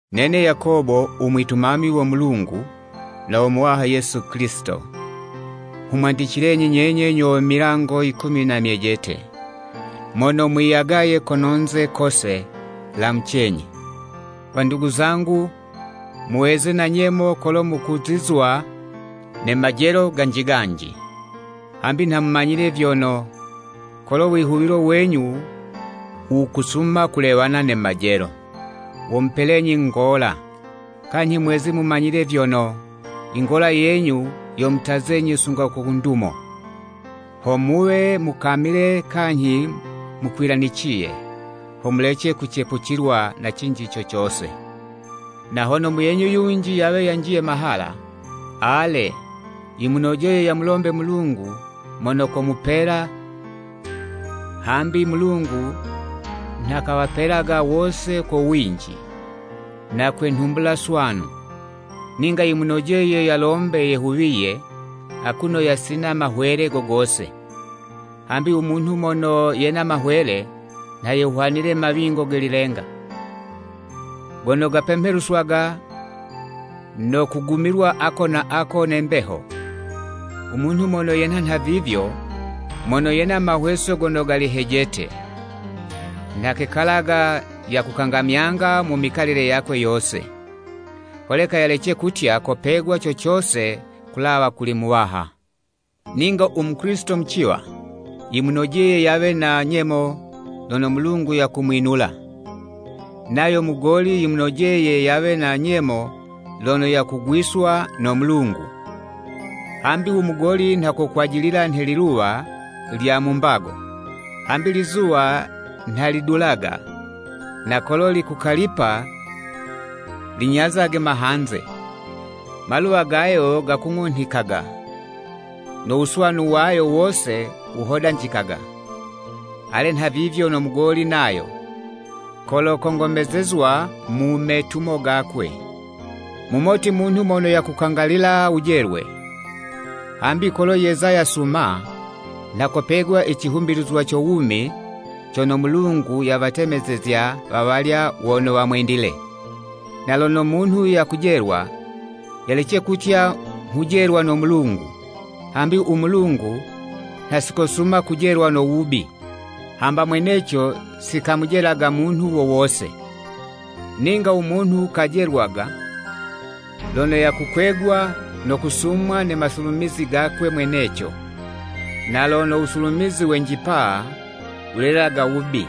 Nene Yakobo, umwitumami wo Mulungu, na wo Muwaha Yesu Kilisito, nghumwandicilenyi nyenye, nyo we milango yikumi na myejete, mono mwiyagaye kono'nze kose. Lamucenyi! Wandugu zangu, muweze na nyemo kolo mukuzizwa ne majelo ganji ganji, hambi nha mumanyile vyono, kolo wihuwilo wenyu wukusuma kulewana ne majelo, womupelenyi ngola. Kanyhi mweze mumanyile vyono, ingola yenyu yomutazenyi sunga ku ndumo, ho muwe mukamile kanyhi mukwilaniciye, ho mulece kucepucilwa na cinji co cose. Na hono muyenyu yunji yawe yanjiye mahala, ale, yimunojeye yamulombe Mulungu mono komupela, hambi Mulungu nha kawapelaga wose ko winji, na kwe nhumbula swanu. Ninga yimunojeye yalombe yehuwiye akuno yasina mahwele, go gose. Hambi u munhu mono yena mahwele nha yehwanile mawingo ge lilenga, gono gapemheluswaga no kugumilwa ako na ako ne mbeho. Umunhu mono yenha nhavivyo, mono yena mahweso gono gali hejete, nha kekalaga yakukangamyanga mu mikalile yakwe yose, holeka yalece kutya kopegwa co cose kulawa kuli Muwaha. Ninga u Mukilisito muciwa, yimunojeye yawe na nyemo lono Mulungu yakumwinula, nayo mugoli, yimunojeye yawe na nyemo lono yakugwiswa no Mulungu. Hambi umugoli nha kokwajilila nhe liluwa lya mu mbago. Hambi lizuwa nha lidulaga, na kolo likukalipa linyazaga mahanze, ne maluwa gayo gakung'unhikaga, no wuswanu wayo wose wuhodanjikaga. Ale nhavivyo, no mugoli nayo, kolo kongomezezwa mu metumo gakwe. Mumoti munhu mono yakukangalila wujelwe, hambi kolo yeza yasuma, nha kopegwa i cihumbilizwa co wumi cono Mulungu yawatemezezya wawalya wono wamwendile. Na lono munhu yakujelwa, yalece kutya, “Nghujelwa no Mulungu.” Hambi u Mulungu nha sikosuma kujelwa no wubi, hamba mweneco, sikamujelaga munhu wo wose. Ninga u munhu kajelwaga lono yakukwegwa no kusumwa ne masulumizi gakwe mweneco. Na lono wusulumizi wenjipa wulelaga wubi,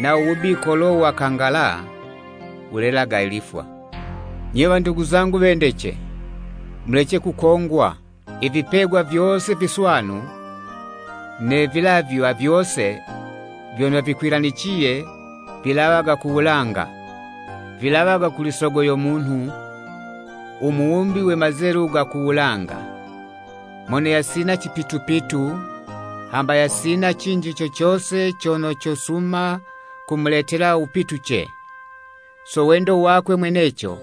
nawo wubi kolo wakangala, wulelaga lifwa. Nye wandugu zangu wendece, mulece kukongwa. Ivipegwa vyose viswanu ne vilavywa vyose vyono vikwilaniciye vilawaga ku wulanga, vilawaga kuli Sogo yo munhu, u Muwumbi we mazelu ga ku wulanga, mono yasina cipitupitu hamba yasina cinji co cose cono cosuma kumuletela wupituce. So wendo wakwe mweneco,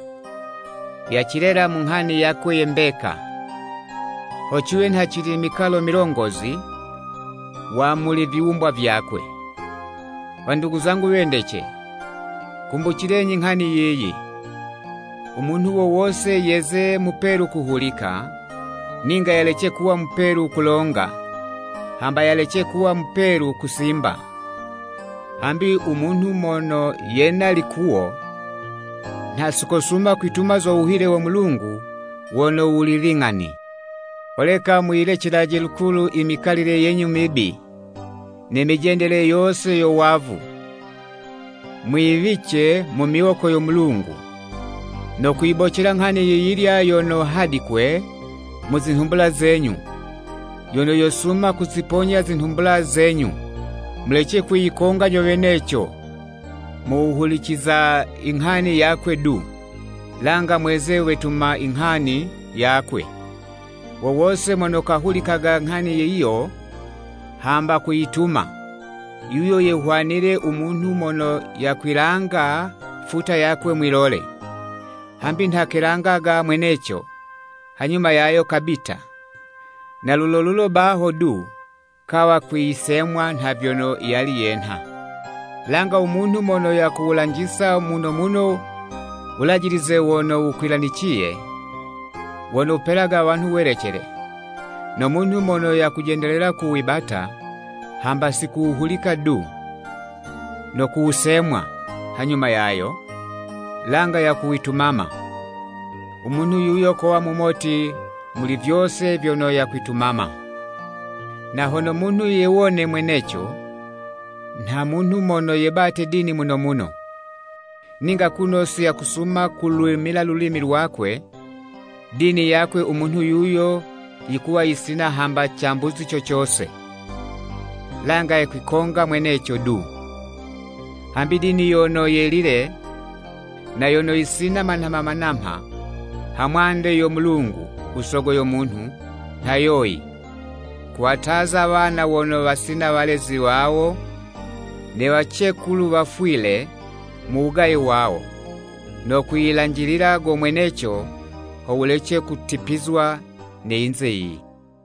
yacilela mu nghani yakwe ye mbeka, ho ciwe nha cili mikalo milongozi wa muli viwumbwa vyakwe. Wandugu zangu wendece, kumbucilenyi nghani yiyi! Umunhu wo wose yeze mupelu kuhulika, ninga yalece kuwa mupelu kulonga, hamba yalece kuwa mupelu kusimba. Hambi u munhu mono yena likuwo, nha sikosuma kwituma zo wuhile wo Mulungu wono wuli ling'ani. Holeka, muyilecelaje lukulu i mikalile yenyu mibi, ne mijendele yose yo wavu, mwiwice mu miwoko yo Mulungu, no kuyibocela nghani yiyilya yono hadikwe mu zinhumbula zenyu, yono yosuma kuziponya zinhumbula zenyu. Mulece kwiyikonga nyo weneco, mu wuhuliciza i nghani yakwe du, langa mweze wetuma i nghani yakwe. Wo wose mono kahulikaga nghani yiyo, hamba kuyituma, yuyo yehwanile u munhu mono yakwilanga futa yakwe mwi'lole. Hambi nha kelangaga mweneco, hanyuma yayo kabita, na lulo lulo baho du kawa kwiyisemwa nha vyono yali yenha. Langa umunhu mono yakuwulanjisa muno muno wulajilize wono wukwilaniciye, wono wupelaga wanhu welecele, no munhu mono yakujendelela kuwibata, hamba sikuwuhulika du, no kuwusemwa hanyuma yayo, langa yakuwitumama, umunhu yuyo kowa mumoti muli vyose vyono yakwitumama. Na hono munhu yewone mweneco nha munhu mono yebate dini muno muno, ninga kuno siyakusuma kulwimila lulimi lwakwe, dini yakwe u munhu yuyo yikuwa yisina hamba cambuzi co cose, langa yakwikonga mweneco du. Hambi dini yono yelile, na yono yisina manamha manamha ha mwande yo Mulungu u Sogo yo munhu, nha yoyi: Kuwataza wana wono wasina walezi wawo, ne wacekulu wafwile mu wugaye wawo, no kwiyilanjilila go mweneco ho wulece kutipizwa ne yinze yiyi.